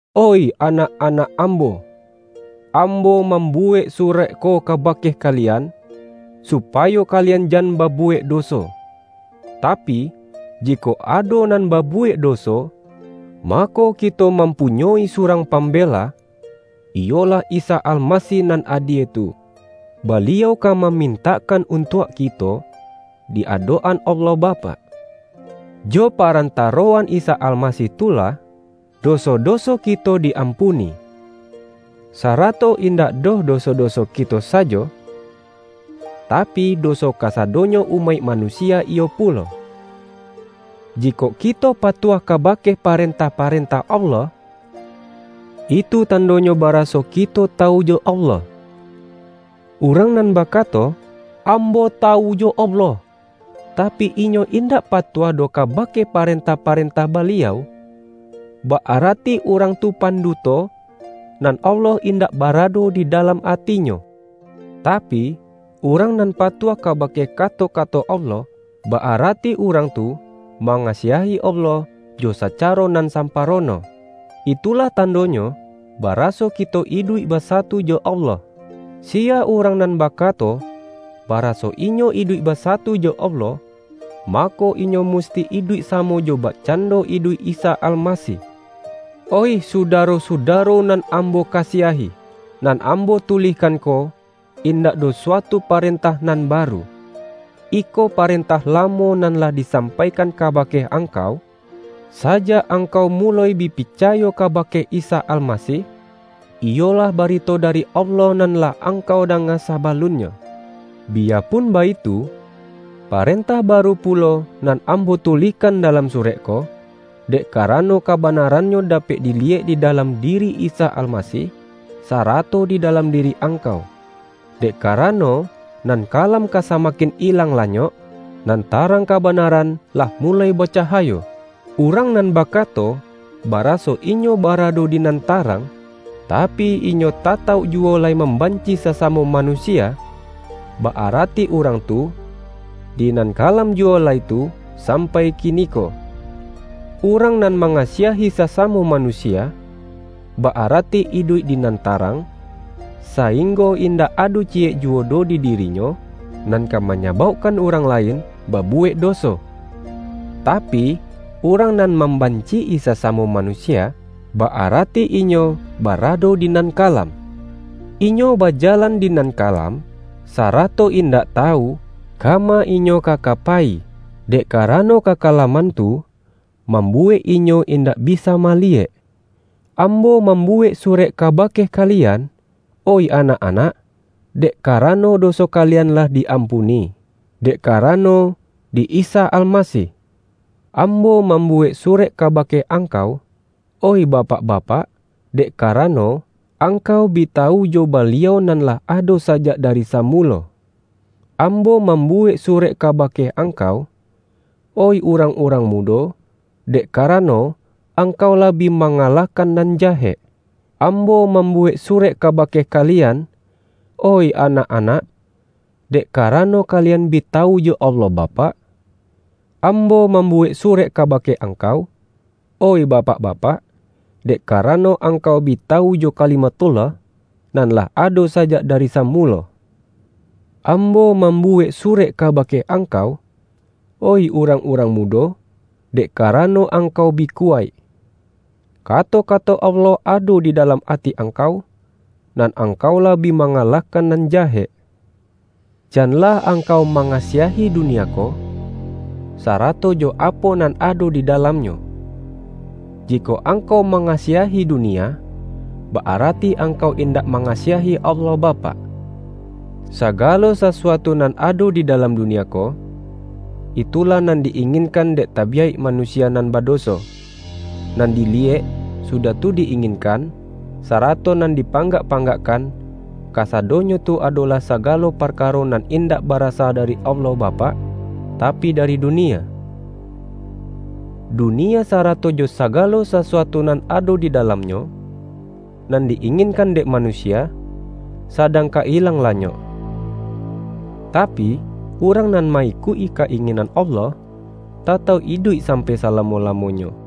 Oih anak-anak ambo! Ambo mambuwek surek ko kabake ka-lian, supayo kalian jan babuwek do-so. Tapi, jikok ado nan babuwek doso, mako, kito mampunyoi surang Pam-bela, iyolah Isa Almasih nan adie tu; Baliau ka mamintakkan untuak kito di adok-an Allah Bapak. Jo paran taroan Isa Almasih tu lah, doso-doso ki-to di-ampuni. Sarato indak doh doso-doso kito sajo, tapi, doso kasadonyo umaik manusia iyo pulo. Jikok kito patuah kabake paren-tah-parentah Allah, itu tandonyo ba-raso kito tawu jo Allah. Urang nan bakato,”Ambo tawu jo Allah,” tapi, inyo indak patuah doh kabake paren-tah-parentah Baliau, ba-arati urang tu panduto, nan Allah indak barado di dalam atinyo. Tapi, urang nan pa-tuah kabake kato-kato Allah, ba-arati urang tu mangasiahi Allah jo sacaro nan samparono. Itulah tandonyo, ba-raso kito iduik basatu jo Allah. Siya urang nan bakato, baraso inyo iduik basatu jo Allah, mako, inyo mus-ti iduik samo jo bakcando iduik Isa Almasih. Oih sudaro-sudaro nan ambo ka-siahi! Nan ambo tulihkan ko, indak doh suatu parentah nan baru. Iko pa-rentah lamo nan lah disampaikan ka-bake angkau, sajak angkau muloi bi picayo kabake Isa Almasih; iyolah ba-rito dari Allah nan lah angkau danga sabalunnyo. Biyapun baitu, parentah baru pu-lo nan ambo tulihkan dalam surek ko; dek karano, kabanarannyo dapek di-liyek di dalam diri Isa Almasih, sara-to di dalam diri angkau. Dek karano, nan kalam ka samakin ilang lanyok, nan tarang kabanaran lah muloi ba-cahayo. Urang nan bakato, baraso inyo ba-rado di nan tarang, tapi, inyo tatauk juwo lai mambanci sasamo manu-sia, ba-arati urang tu, di nan kalam juwo lai tu sampai kiniko. Urang nan mangasiahi sasamo manusia, ba-arati iduik di nan tarang, sainggo in-dak ado ciyek juwo doh di dirinyo, nan ka manyabaukkan urang lain ba-buwek doso. Tapi, urang nan mam-banci-i sasamo manusia, ba-arati inyo barado di nan kalam. Inyo bajalan di nan kalam, sarato indak tawu, kama inyo ka ka payi, dek karano kakalam-an tu, mambuwek inyo indak bisa ma-liyek. Ambo mambuwek surek kabake kalian, oih anak-anak, dek karano do-so kalian lah di-ampuni, dek karano di Isa Almasih. Ambo mambuwek surek kabake angkau, oih bapak-ba-pak, dek karano, angkau bi tawu jo Baliau nan lah ado sajak dari samulo. Ambo mambuwek surek kabake ang-kau, oih urang-urang mudo, dek ka-rano, angkau lah bi mangalahkan nan jahek. Ambo mambuwek surek kabake kalian, oih anak-anak, dek karano, kalian bi tawu jo Allah Bapak. Am-bo mambuwek surek kabake angkau, oih bapak-bapak, dek karano, ang-kau bi tawu jo Kalimathullah, nan lah ado sajak dari samulo. Ambo mambu-wek surek kabake angkau, oih urang-urang mudo, dek karano, angkau bi kuwaik. Kato-kato Allah ado di dalam ati angkau, nan angkau lah bi manga-lahkan nan jahek. Janlah angkau mangasiahi dunia ko, sarato jo apo nan ado di dalamnyo. Jikok angkau mangasiahi dunia, ba-arati angkau indak mangasiahi Allah Bapak. Sagalo sasuatu nan ado di dalam dunia ko — itulah nan di-ingin-kan dek tabiyaik manusia nan bado-so, nan diliyek, sudah tu di-inginkan, sarato nan di panggak-panggakkan — kasadonyo tu adolah sagalo parkaro nan indak barasa dari Allah Bapak, tapi dari dunia. Dunia sarato jo sa-galo sasuatu nan ado di dalamnyo, nan di-inginkan dek manusia, sadang ka ilang lanyok. Tapi, urang nan ma-ikuik-i ka-inginan Allah, tatauk iduik sampai salamo-lamonyo.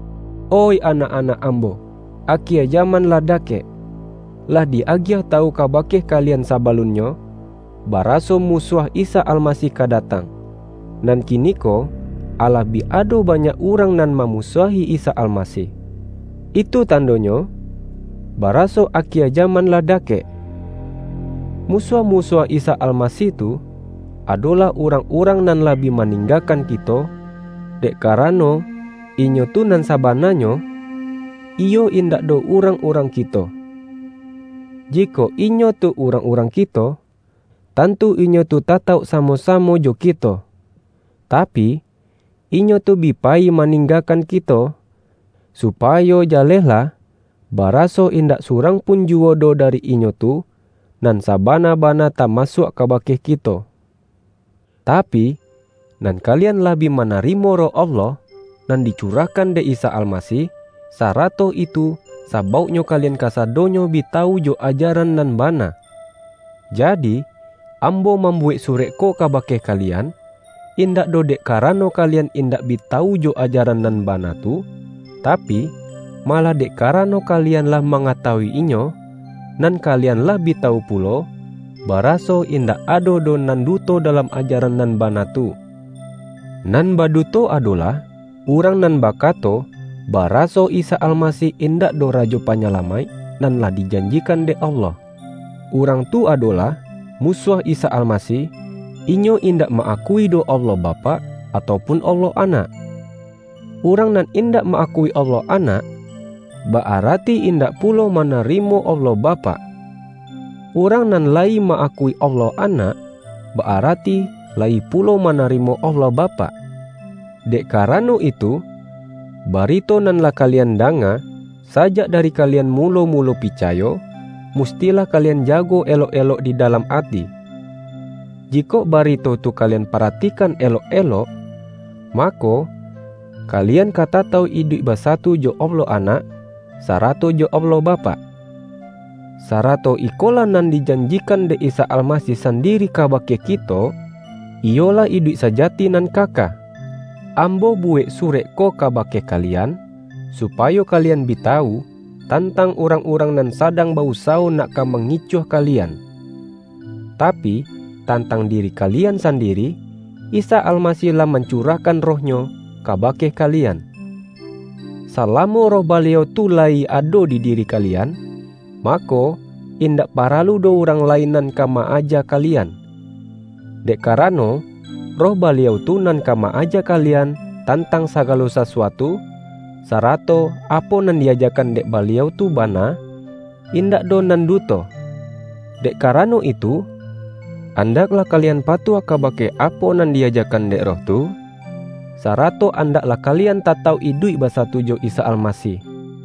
Oih anak-anak ambo, akie jaman lah dakek! Lah di-agiah tawu kabake kalian sabalunnyo, baraso Musuah Isa Almasih ka datang; nan kiniko alah bi ado banyak urang nan mamusuahi Isa Almasih. Itu tandonyo baraso akie jaman lah dakek. Musuah-musuah Isa Almasih tu, adolah urang-urang nan lah bi maninggakan kito, dek ka-rano, inyo tu nan sabananyo, iyo in-dak doh urang-urang kito. Jikok inyo tu urang-urang kito, tantu inyo tu tatauk samo-samo jo kito. Tapi, inyo tu bi payi maninggakan kito, supayo ja-lehlah, baraso indak surang pun juwo doh dari inyo tu, nan sabana-bana ta-masuak kabake kito. Tapi, nan kalian lah bi manari-mo Roh Allah nan dicurahkan dek Isa Almasih, sarato itu sabauknyo kalian kasadonyo bi tawu jo ajaran nan ba-na. Jadi, ambo mambuwek surek ko kabake kalian, indak doh dek ka-rano kalian indak bi tawu jo ajaran nan bana tu, tapi, malah dek karano kalian lah mangatawu-inyo, nan ka-lian lah bi tawu pulo, baraso indak ado doh nan duto dalam ajaran nan bana tu. Nan baduto, adolah urang nan bakato, baraso Isa Almasih indak doh Rajo Panyalamaik nan lah dijanjikan dek Allah. Urang tu adolah Musuah Isa Almasih; inyo indak ma-akui doh Allah Bapak, atau pun Allah Anak. Urang nan indak ma-akui Allah Anak, ba-arati indak pulo manarimo Allah Bapak. Urang nan layi ma-akui Allah Anak, ba-arati layi pulo mana-rimo Allah Bapak. Dek karano itu, barito nan lah kalian danga, sajak dari kalian mu-lo-mulo picayo, mustilah kalian jago elok-elok di dalam ati. Jikok barito tu kalian paratikan elok-elok, mako, kalian ka tatauk iduik basatu jo Allah Anak, sarato jo Allah Bapak. Sarato ikolah nan dijanjikan dek Isa Almasih sandiri kabake kito: iyolah iduik saja-ti nan kaka. Ambo buwek surek ko kabake ka-lian, supayo kalian bi tawu, tantang urang-urang nan sadang ba-usawo nak ka mangicuah kalian. Tapi, tantang diri kalian sandiri, Isa Alma-sih lah mancurahkan Roh-Nyo kaba-ke kalian. Salamo Roh Baliau tu layi ado di diri kalian, mako, indak para-lu doh urang lain nan ka ma-aja kali-an. Dek karano, Roh Baliau tu nan ka ma-aja kalian tantang sagalo sasuatu; sarato apo nan di-ajakan dek Baliau tu bana, indak doh nan duto. Dek ka-rano itu, andaklah kalian patuah ka-bake apo nan di-ajakan dek Roh tu, sarato andaklah kalian tatauk iduik basatu jo Isa Almasih.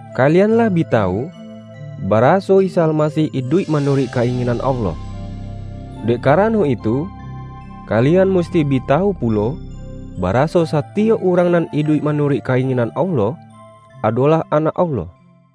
Kalian lah bi tawu, baraso Isa Almasih iduik ma-nuruik ka-inginan Allah. Dek karano itu, kalian musti bi tawu pulo, baraso satiyok urang nan iduik manuruik ka-inginan Allah, adolah anak Allah.